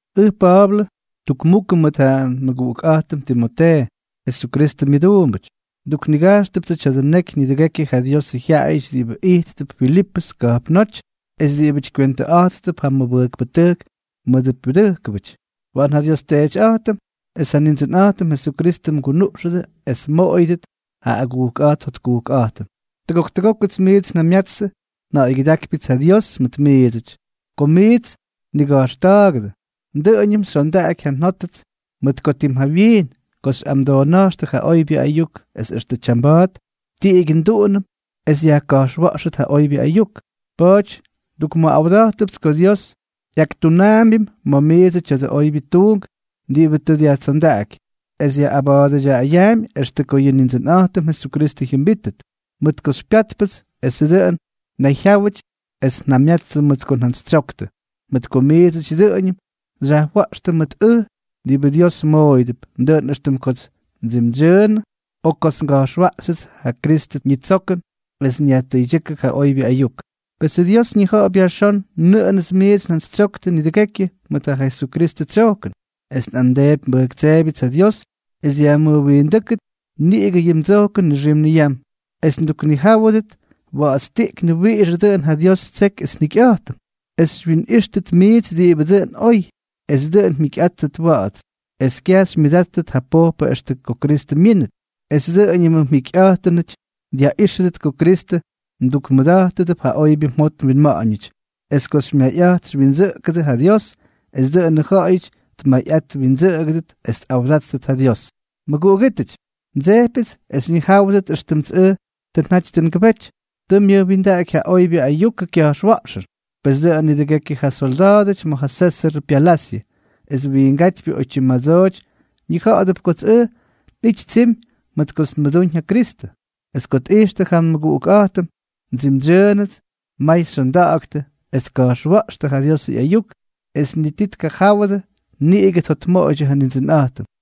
Ʉj Pa̱a̱blʉ, tukmukʉ mʉt ja nmʉguꞌukꞌa̱jtʉm Timotee, Jesukristʉ myʉduumbʉty. Nduknigajxtʉptsʉ tya̱dʉ neky nidʉgekyʉ ja Diosʉ jyaꞌayʉty diꞌibʉ ijttʉp Filipʉs ka̱jpnóty es diꞌibʉty kywentʉꞌa̱jttʉp ja mʉbʉjkpʉtʉjk mʉdʉ pyudʉjkʉbʉty. Waꞌan ja nDios Teetyꞌa̱jtʉm es ja Nindsʉnꞌa̱jtʉm Jesukristʉ mgunuꞌxʉdʉ es mmoꞌoyʉdʉt ja agujkꞌa̱jt jotkujkꞌa̱jtʉn. Tʉgok tʉgókʉts miits njamyatstʉ, nja̱ꞌa̱ygyʉdákypyʉts ja Dios mʉt miidsʉty. Kots miits nniga̱jxta̱a̱gʉdʉ, dʉꞌʉñʉm xyondaꞌaky ja nꞌa̱a̱ njot mʉt ko tim jawyiin ko xyꞌamʉdoona̱jxtʉ ja oybyʉ ayuk es extʉ tyamba̱a̱t, tiꞌigyʉ nduꞌunʉm es yajka̱jxwa̱ꞌxʉt ja oybyʉ ayuk. Pa̱a̱ty ndukmʉꞌawda̱jtʉpts ko Dios ꞌyaktunaambyʉm ma̱ miidsʉ tya̱dʉ oybyʉ tuunk diꞌibʉ tʉ dyajtsondaꞌaky, es yaꞌꞌabatʉdyaꞌayaampy extʉ ko yʉ Nindsʉnꞌa̱jtʉm Jesukristʉ jyʉmbítʉt. Mʉt ko xypyátpʉts esʉts dʉꞌʉn nnayjyáwʉty es njamyatstʉ mʉt ko njantsytsyoktʉ, mʉt ko miidsʉty dʉꞌʉñʉm xyajwa̱ꞌxtʉ mʉt ʉj diꞌibʉ Dios mmooyʉdʉp, dʉꞌʉn éxtʉm kots ndsimdsyʉʉnʉ o kots nga̱jxwaꞌxyʉts ja Kristʉ ñitsokʉn es nyajtʉydyʉ́kʉ ja oybyʉ ayuk. Pesʉ Dios ñija̱ꞌa̱p yajxón nʉꞌʉnʉts miits njantsytsyoktʉ nidʉgekyʉ mʉt ja Jesukristʉ tsyojkʉn, es nꞌamdeepy nbʉjktseebyʉts ja Dios es dyajmʉjwindʉ́kʉt niꞌigʉ yʉ mdsojkʉn nixim niyam, es mduknijáwʉdʉt wa̱ꞌa̱tstiꞌknʉ wiꞌixʉ dʉꞌʉn ja Dios ttseky es njikyꞌa̱jtʉm, es xywyinꞌíxtʉt miits diꞌibʉ dʉꞌʉn oy, es dʉꞌʉn mjikyꞌáttʉt wa̱ꞌa̱ts, es kyaj xymyʉdáttʉt ja pojpʉ extʉ ko Kristʉ myínʉt, es dʉꞌʉñʉmʉ mjikyꞌa̱jtʉnʉty dyaꞌíxʉdʉt ko Kristʉ mdukmʉda̱jtʉdʉp ja oybyʉ mjot mwinma̱ꞌa̱ñʉty, es ko xymyayꞌat xywyindsʉꞌʉgʉdʉ ja Dios, es dʉꞌʉnʉ jaꞌayʉty tmayꞌat twindsʉꞌʉgʉdʉt es tꞌawdáttʉt ja Dios. Mʉguꞌugítʉty, ndsejpyʉts es xyñijáwʉdʉt éxtʉmts ʉj tʉ njaty tʉ ngʉbety, tʉ myʉjwindaꞌaky ja oybyʉ ayukʉ kya̱jxwa̱ꞌxʉn. Pes dʉꞌʉn nidʉgekyʉ ja solda̱a̱dʉty ma̱ ja Sésʉr pyalasyʉ esʉ wiingátypyʉ oytyim madsooty ñija̱ꞌa̱dʉp kots ʉj nꞌity tsimy mʉt kots nmʉdúñ ja Kristʉ. Es ko tꞌijxtʉ ja nmʉguꞌukꞌa̱jtʉm ndsimdsyʉʉnʉts, may xyonda̱ꞌa̱ktʉ es tka̱jxwa̱ꞌxtʉ ja Diosʉ ꞌyayuk, es ni ti tkajáwʉdʉ, niꞌigʉ tjotmoꞌoydyʉ ja Nindsʉnꞌa̱jtʉm.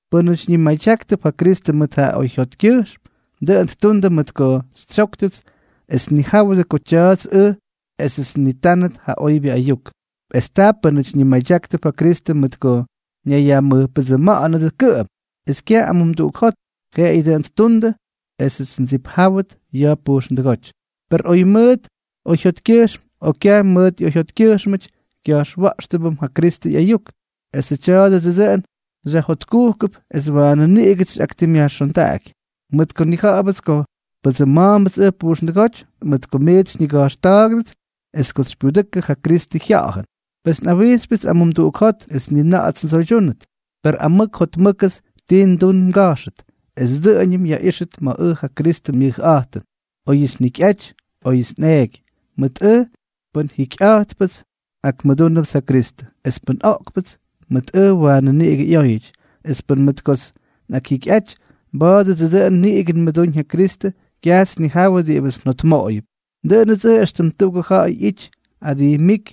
Pʉ́nʉty ñimadyáktʉp ja Kristʉ mʉt ja oyjyotkyʉjxm, dʉꞌʉn ttundʉ mʉt ko xytsyóktʉts es tnijáwʉdʉ ko tya̱a̱ts ʉj esʉts nnitánʉt ja oybyʉ ayuk; es ta pʉ́nʉty ñimadyáktʉp ja Kristʉ mʉt ko ñayyajmʉjpʉdsʉma̱ꞌa̱nʉdʉ kʉꞌʉm, es kyaj amumduꞌuk jot, jeꞌeyʉ dʉꞌʉn ttundʉ esʉts ndsipjáwʉt ya̱ pujxndʉgóty. Per oy mʉt oyjyotkyʉjxm o kyaj myʉtꞌoyjyotkʉjxmʉty, kya̱jxwa̱ꞌxtʉbʉm ja Kristʉ ꞌyayuk; esʉ tya̱a̱dʉdsʉ dʉꞌʉn xyajjotkujkʉp es waanʉ niꞌigʉts xyꞌaktimꞌyajxondaꞌaky, mʉt ko nnija̱ꞌa̱bʉts ko pʉdsʉma̱a̱mbʉts ʉj pujxndʉgóty mʉt ko miits xyñiga̱jxta̱ꞌa̱ktʉdʉts es kots xypyudʉkʉ ja Kristʉ Jya̱ꞌa̱jʉn. Pes nꞌawijxypyʉts amumduꞌuk jot es ni na̱ꞌa̱ts ndsoytyúnʉt, per amʉk jotmʉ́kʉts ti ndun nga̱jxʉt es dʉꞌʉñʉm yajꞌíxʉt ma̱ ʉj ja Kristʉ myʉjꞌa̱jtʉn, óyʉts njikyꞌaty o óyʉts nꞌeeky. Mʉt ʉj, pʉn akjikyꞌa̱jtpʉts, nꞌakmʉdúnʉpts ja Kristʉ; es pʉn oꞌkpʉts, mʉt ʉj waanʉ niꞌigʉ ꞌyóyʉty. Es pʉn mʉt kots nꞌakjikyꞌaty, mba̱a̱dʉdsʉ dʉꞌʉn niꞌigʉ nmʉdúñ ja Kristʉ. Kyajts nnijawʉ diꞌibʉts njotmoꞌoyʉp. Dʉꞌʉnʉts ʉj éxtʉm tuꞌugʉ ja̱ꞌa̱y ꞌyity adijmíky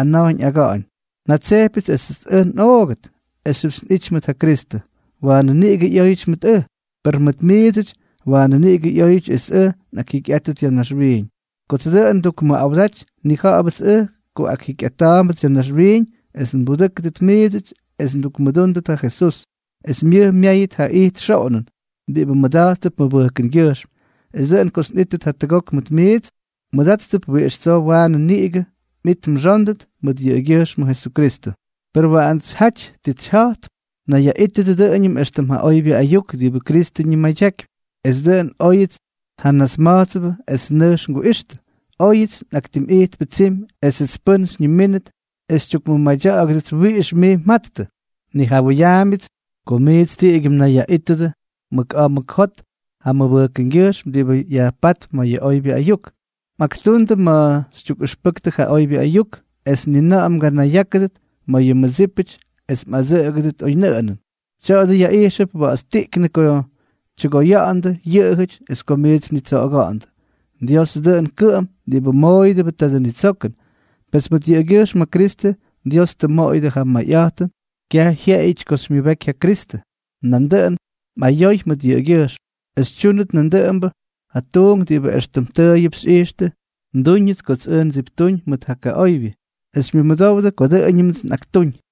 ana̱jñ aga̱ꞌa̱ñ: njatsejpyʉts esʉts ʉj nꞌoogʉt esxyʉpts nꞌity mʉt ja Kristʉ. Waanʉ niꞌigʉ ꞌyóyʉty mʉt ʉj, per mʉt miidsʉty, waanʉ niꞌigʉ ꞌyóyʉty esʉts nꞌakjikyꞌátʉt ya̱ naxwiiñ. Kots dʉꞌʉn ndukmʉꞌawdaty, nnija̱ꞌa̱bʉts ʉj ko akjikyꞌata̱a̱mbʉts ya̱ naxwiiñ es nbudʉ́kʉdʉt miidsʉty es ndukmʉdúndʉt ja Jesús, es myʉj myáyʉt ja it xoꞌonʉn diꞌibʉ mmʉda̱jttʉp mʉbʉjkʉngyʉjxm, es dʉꞌʉn kots nꞌítʉt jatʉgok mʉt miits, mmʉdáttʉp wiꞌix tsoo waanʉ niꞌigʉ mꞌit mxóndʉt mʉt yʉꞌʉgyʉjxmʉ Jesukristʉ. Per waꞌants xyjaty tits xyja̱jtp: nayyaꞌítʉdʉ dʉꞌʉñʉm éxtʉm ja oybyʉ ayuk diꞌibʉ Kristʉ ñimadyakypy, es dʉꞌʉn óyʉts xyjanasma̱jtsʉbʉ es nʉjx nguꞌixtʉ, o óyʉts nꞌaktimꞌijtpʉ tsimy esʉts pʉ́n xyñimínʉt es xytyukmʉmadya̱ꞌa̱gʉdʉts wiꞌix miits mjattʉ, nnijawʉyaambyʉts ko miits tiꞌigyʉ mnayyaꞌítʉdʉ mʉk aa mʉk jot ja mʉbʉjkʉngyʉjxm diꞌibʉ yajpátp ma̱ ja oybyʉ ayuk, mꞌaktundʉ ma̱ xytyukꞌʉxpʉktʉ ja oybyʉ ayuk, es ni na̱ꞌa̱ mganayyákʉdʉt ma̱ yʉ mmʉdsípʉty es mꞌadsʉꞌʉgʉdʉt oynʉꞌʉnʉn. Tya̱a̱dʉ yaꞌijxʉp wa̱ꞌa̱tstiꞌknʉ ko tyʉgoya̱ꞌa̱ndʉ yʉꞌʉjʉty es ko miits mnitsoꞌoga̱ꞌa̱ndʉ. Diosʉ dʉꞌʉn kʉꞌʉm diꞌibʉ mmooyʉdʉbʉ tadʉ nitsokʉn. Pes mʉt yʉꞌʉgyʉjxm ja Kristʉ Dios tʉ mmoꞌoyʉdʉ ja mayꞌa̱jtʉn kyaj jyeꞌeyʉty ko xymyʉbeky ja Kristʉ, nandʉꞌʉn mꞌayoy mʉt yʉꞌʉgyʉjxm es xytyúnʉt nandʉꞌʉmbʉ ja tuunk diꞌibʉ éxtʉm tʉʉyʉp xyꞌixtʉ ndúñʉts kots ʉj ndsiptuuñ mʉt ja kaꞌoybyʉ, es xymyʉdowdʉ ko dʉꞌʉñʉmts nꞌaktúñ.